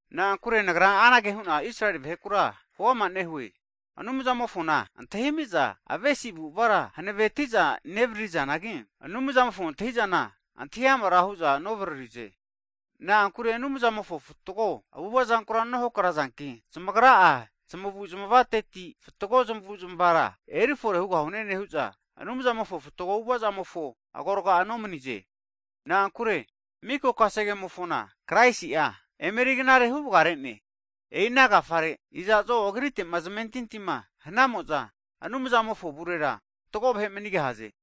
Na'ankure nagra anage hu'na Israeli vahekura huama nehue, Anumzamofona antahimi'za avesi avu'avara hanavetiza nevaririzanagi, Anumzamofo antahi'zana antahi amara hu'za novaririze. Na'ankure Anumzamofo fatgo avu'avazankura nohakrazanki, zamagra'a zmavuzmavateti fatgo zmavuzmavara erifore hugahune nehu'za, Anumzamofo fatgo avu'avazamofo agorga'a nomanize. Na'ankure miko kasegemofona Kraisi'a emeri knare huvagarene. E'i ana agafare iza'zo Agrite'ma zamentintima hanamo'za Anumzamofo avurera fatgo vahe manigahaze.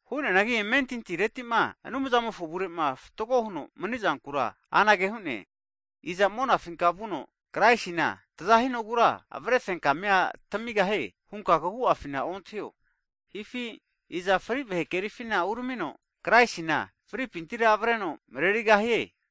Hu'neanagi amentintiretima Anumzamofo avure'ma fatgo huno mani'zankura anage hu'ne, Iza monafinka vuno Kraisina tazahinogura avrefenkamia tamigahie hunka kagu'afina ontahio. Hifi iza fri vahe kerifina uramino, Kraisina fripintira avreno marerigahie?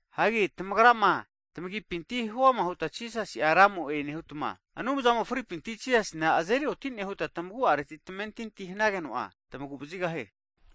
Hagi tamagra'ma tamagipinti huama huta Jisasi'a Ramo'e nehutma, Anumzamo fripinti Jisasina azeri oti'ne huta tamagu'areti tamentinti hanageno'a, tmaguvazigahie.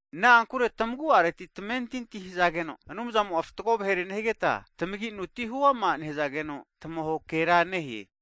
Na'ankure tamagu'areti tamentinti hazageno, Anumzamo'a fatgo vahere nehigeta, tamaginuti huama nehazageno, tamahokera nehe.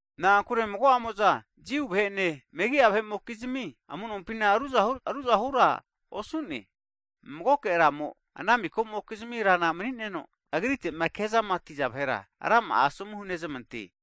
Na'ankure mago'zamo'a Jiu vahe'ene megi'a vahe'mokizmi amu'nonpina ruzahura osu'ne. Magoke Ramo ana mikamokizmi Rana mani'neno, Agritegama kezamatiza vahera rama'a asomu hunezmante.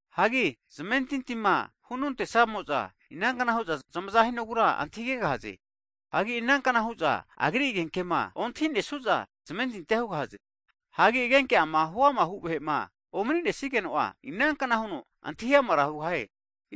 Hagi zamentintima hunontesamo'za, inankna hu'za zamaza hinogura antahigegahaze. Hagi inankna hu'za Agri agenkema ontehinesu'za zmentintia hugahaze? Hagi agenke ama huamahu vahe'ma omaninesige'za, inankna hu'za antahi amara hugahaze?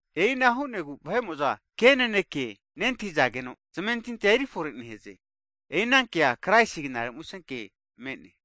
E'ina hu'negu vahe'mo'za ke naneke nentahizageno, zamentintia erionetie. E'i anankea Kraisina Knare Musenke me'ne.